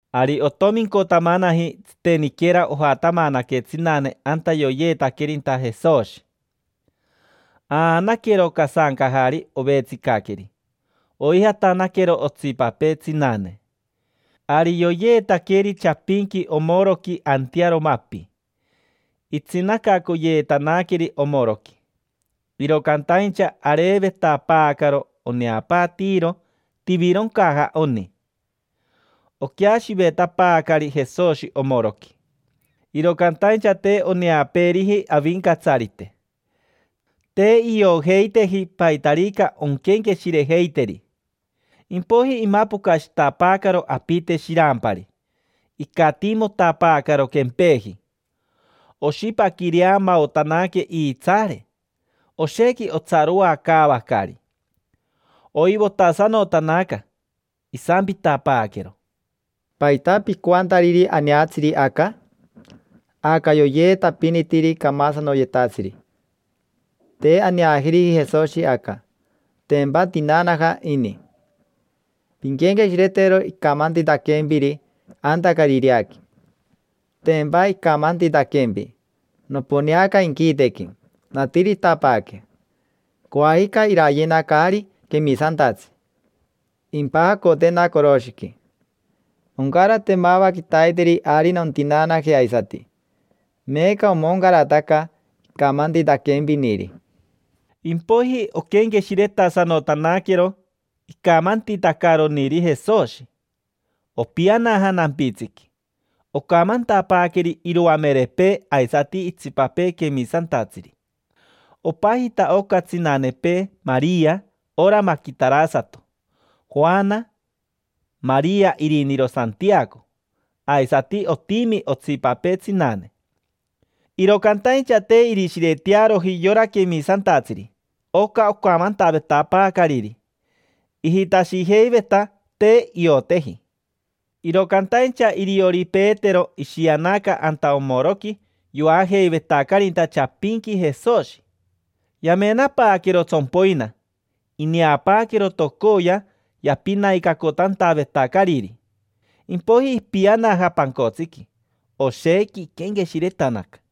Ari otomincotamanaji, tsiteniquera ojatamanaque tsinane anta yoyeetaquerinta Jesoshi. Aanaquero casancajari ovetsicaqueri. Oijatanaquero otsipapee tsinane. Ari yoyeetaqueri chapinqui omoroqui antearo mapi, itsinacacoyeetanaqueri omoroqui. Iro cantaincha areevetapaacaro oneapaatiiro tivironcaja oni. Oqueashivetapaacari Jesoshi omoroqui, iro cantaincha te oneapeeriji Avincatsarite. Te iojeiteji paitarica onquenqueshirejeiteri. Impoiji imapocashitapaacaro apite shirampari, icatiimotapaacaro quempeji. Oshipaquireamaotanaque iitsaare. Oshequi otsaroacaavacari, oivotasanotanaca. Isampitapaaquero: —¿Paita picoantariri aneatsiri aca? Aca yoyeetapinitiri camasanoyetatsiri. Te aneajeriji Jesoshi aca, tempa tinaanaja ini. Pinquenqueshiretero icamantitaquempiri anta Carireaqui. Tempa icamantitaquempi: “Noponeaca inquitequi, natiritapaaque. Coajica irayena caari quemisantatsi, impajacotena coroshiqui. Oncarate mava quitaiteri ari nontinaanaje aisati”. Meeca omoncarataca icamantitaquempiniri. Impoiji oquenqueshiretasanotaquero icamantitacaroniri Jesoshi. Opianaja nampitsiqui, ocamantapaaqueri iroamerepee aisati itsipapee quemisantatsiri. Opajita oca tsinanepee Maria ora maquitarasato, Joana, Maria iriniro Santiaco; aisati otimi otsipapee tsinane. Iro cantaincha te irishiretearoji yora quemisantatsiri oca ocamantavetapaacariri, ijitashijeiveta te ioteji. Iro cantaincha iriori Petero ishianaca anta omoroqui yoajeivetacarinta chapinqui Jesoshi. Yamenapaaquero tsompoina, ineapaaquero tocoya yapinaicacotantavetacariri. Impoiji ipianaja pancotsiqui, oshequi iquenqueshiretanaca.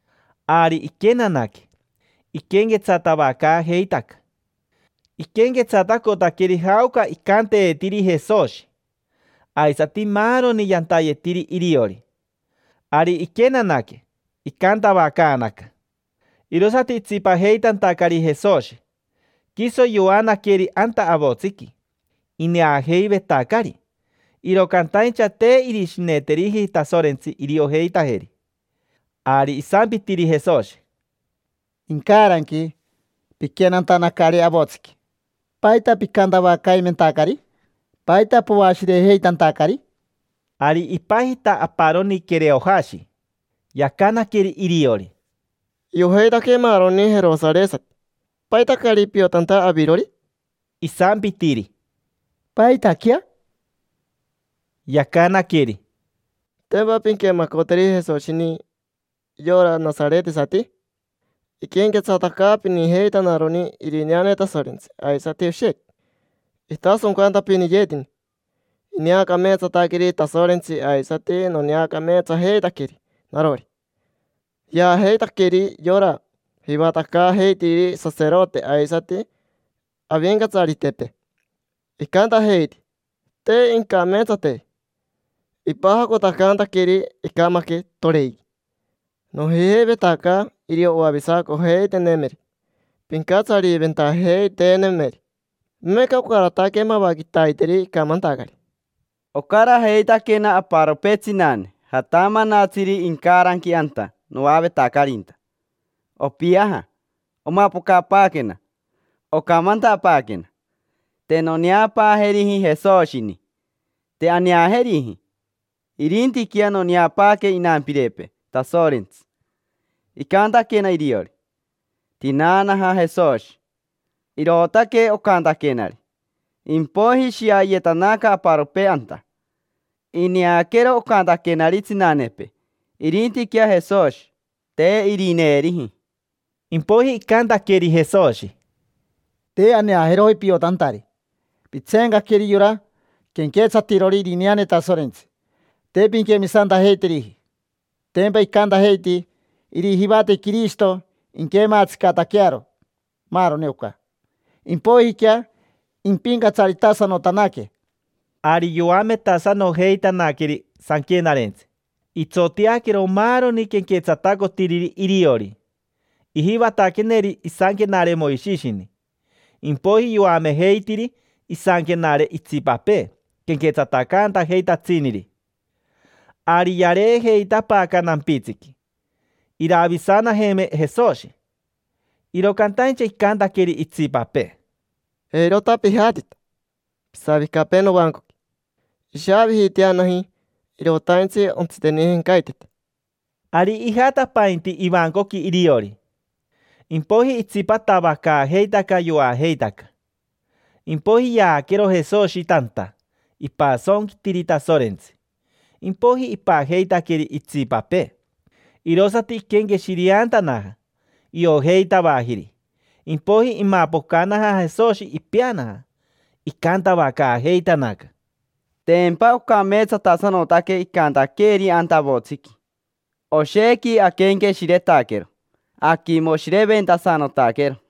Ari iquenanaque, iquenquetsatavacaajeitaca. Iquenquetsatacotaqueri jaoca icanteetiri Jesoshi, aisati maaroni yantayetiri iriori. Ari iquenanaque, icantavacaanaca, irosati itsipajeitantacari Jesoshi, quiso yoanaqueri anta avotsiqui. Ineajeivetacari, iro cantaincha te irishineteriji Tasorentsi iriojeitajeri. Ari isampitiri Jesoshi: —Incaranqui, piquenantacari avotsiqui, ¿paita picantavacaimentacari? ¿Paita poashirejeitantacari? Ari ipajita aparoni Quereojashi, yacanaqueri iriori: —Iojeitaque maaroni jerosaresati: ¿paita caari piotanta avirori? Isampitiri: —¿Paitaquea? Yacanaqueri: —¿Tempa pinquemacoteri Jesoshini, yora nasaretesati? Iquenquetsatacaapinijeitanaroni irineane Tasorentsi aisati oshequi itasoncantapiniyetini. Ineacameetsataqueri Tasorentsi aisati noneacameetsajeitaqueri narori. Yaajeitaqueri yora jivatacaajeitiriri saserote aisati avincatsaritepee. Icantajeiti te incameetsateji, ipajacotacantaqueri, icamaque toren. Nojijeivetaca irio oavisacojeiteenemeri, pincatsariventajeiteenemeri. Meeca ocarataque mava quitaiteri icamantacari. Ocarajeitaquena aparopee tsinane jatamanatsiri incaranqui anta noavetacarinta. Opiaja, omapocapaaquena, ocamantapaaquena: “Te noneapaajeriji Jesoshini, te aneajeriji. Irintiquea noneapaaque inampirepee Tasorentsi, icantaquena iriori: ‘Tinaanaja Jesoshi’”. Irootaque ocantaquenari. Impoiji ishiayetanaca aparopee anta, ineaquero ocantaquenari tsinanepee: irintiquea Jesoshi, te irineeriji. Impoiji icantaqueri Jesoshi: —Te aneajeroji piojeitantari, pitseencaqueri yora quenquetsatirori irineane Tasorentsi. Te pinquemisantajeiteriji. Tempa icantajeiti irijivate Quirishito inquematsicataquearo maaroni oca, impoijiquea impincatsaritasanotanaque. Ari yoametasanojeitanaqueri Sanquenarentsi, itsoteaquero maaroni quenquetsatacotiriri iriori. Ijivataqueneri isanquenare Moishishini, impoiji yoamejeitiri isanquenare itsipapee quenquetsatacantajeitatsiniri. Ari yareejeitapaaca nampitsiqui, iravisanajeme Jesoshi, iro cantaincha icantaqueri itsipapee: —Eirota pijatita, pisavicapee novancoqui. Ishaavijiiteanaji, irotaintsi ontsitenijencaitete. Ari ijatapainti ivancoqui iriori. Impoiji itsipatavacaajeitaca, yoajeitaca. Impoiji yaaquero Jesoshi tanta, ipasonquitiri Tasorentsi, impoiji ipajeitaqueri itsipapee. Irosati iquenqueshireantanaja, iojeitavajiri. Impoiji imapocanaja Jesoshi, ipeanaja. Icantavacaajeitanaca: —Tempa ocameetsatasanotaque icantaqueeri anta avotsiqui. Oshequi aquenqueshiretaquero, aquimoshireventasanotaquero.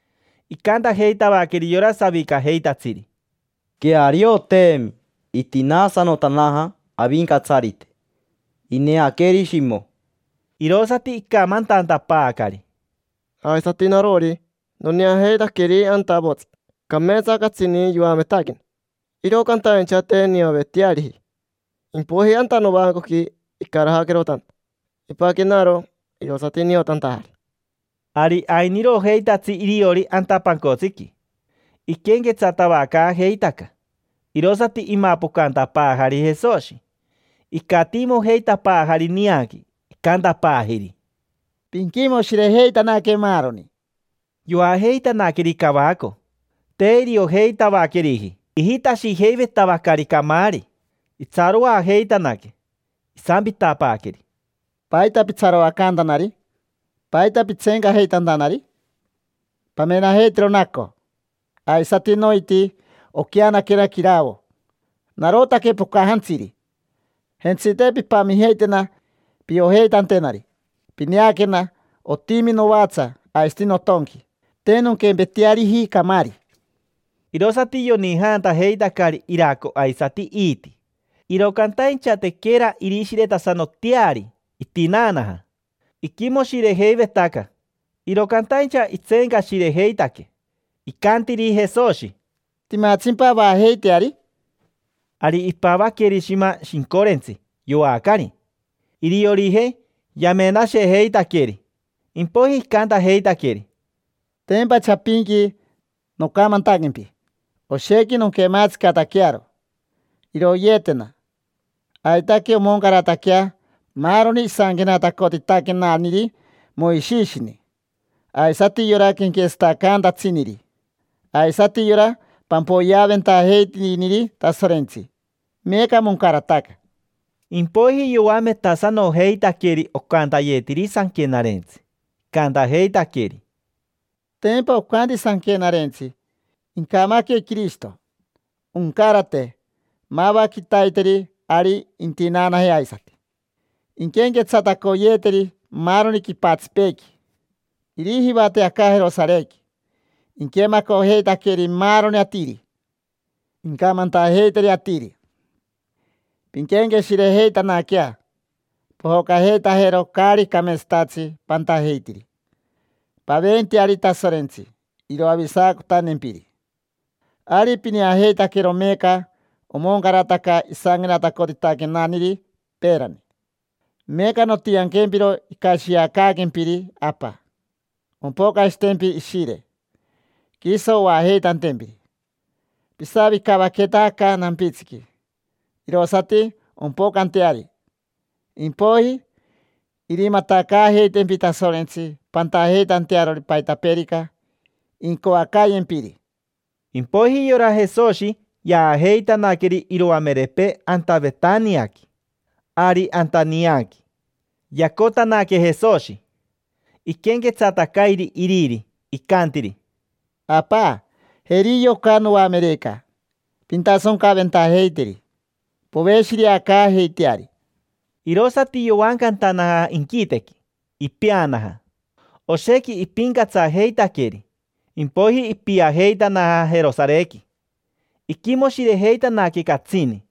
Icantajeitavaqueri yora savicajeitatsiri: —Quearioteemi: itinaasanotanaja Avincatsarite. Ineaqueri Shimo. Irosati icamantantapaacari: —Aisati narori, noneajeitaqueri anta avotsiqui, cameetsa catsini yoametaquena, iro cantaincha te nioveteariji. Impoiji anta novancoqui icarajaquero tanta, ipaquenaro, irosati niotantajari. Ari ainirojeitatsi iriori anta pancotsiqui, iquenquetsatavacaajeitaca, irosati imapocantapaajari Jesoshi, icatiimojeitapaajari nianqui. Icantapaajiri: —Pinquimoshirejeitanaque, maaroni. Yoajeitanaqueri cavaco, te iriojeitavaqueriji, ijitashijeivetavacari camaari. Itsaroajeitanaque. Isampitapaaqueri: —¿Paita pitsaroacantanari? ¿Paita pitseencajeitantanari? Pamenajeitero naco aisati noiti oqueanaquena quiravo. Narotaque pocajantsiri. Jentsite, pimpamijeitena piojeitantenari. Pineaquena, otimi novatsa aisati notonqui, te nonquempeteariji camaari. Irosati yonijantajeitacari iraco aisati iiti. Iro cantaincha tequera irishiretasanoteari itinaanaja. Iquimoshirejeivetaca, iro cantaincha itseencashirejeitaque. Icantiri Jesoshi: —¿Timatsimpa avajeiteari? Ari ipavaqueri shima shincorentsi, yoacari. Iriorijei yamenashejeitaqueri, sorerere. Impoiji icantajeitaqueri: —Tempa chapinqui nocamantaquempi: “Oshequi nonquematsicataquearo, iroyeetena. Aitaque omoncarataquea maaroni isanquenatacotitaquenaniri Moishishini, aisati yora quenquetsatacaantatsiniri, aisati yora pampoyeaventajeitiriniri Tasorentsi”. Meeca moncarataca. Impoiji yoametasanojeitaqueri ocantayetiri Sanquenarentsi, icantajeitaqueri: —Tempa ocanti Sanquenarentsi: “Incamaque Quirishito, oncarate mava quitaiteri ari intinaanaje aisati. Inquenquetsatacoyeeteri maaroni quipatsipeequi, irijivate aca Jerosarequi: inquemacojeitaqueri maaroni atiri. Incamantajeiteri atiri: ‘Pinquenqueshirejeitanaquea, pojocajeitajero caari cameetsatatsi pantajeitiri. Paventeari Tasorentsi iroavisacotantempiri’”. Ari pineajeitaquero meeca omoncarataca isanquenatacotitaquenaniri peerani. Meeca nontianquempiro icashiacaaquempiri Apa: ompocashitempi Ishire, quiso oajeitantempiri. Pisavicavaqueta aca nampitsiqui irosati ompocanteari. Impoiji irimatacaajeitempi Tasorentsi pantajeitantearori paitapeerica incoacaayempiri. Impoiji yora Jesoshi yaajeitanaqueri iroamerepee anta Vetaniaqui. Ari anta nianqui, yacotanaque Jesoshi, iquenquetsatacairi iriri, icantiri: —Apa, jeri yoca noamereca: pintasoncaventajeiteri, poveshireacaajeiteari. Irosati yovancantanaja inquitequi, ipeanaja. Oshequi ipincatsajeitaqueri, impoiji ipiajeitanaja Jerosarequi, iquimoshirejeitanaque catsini.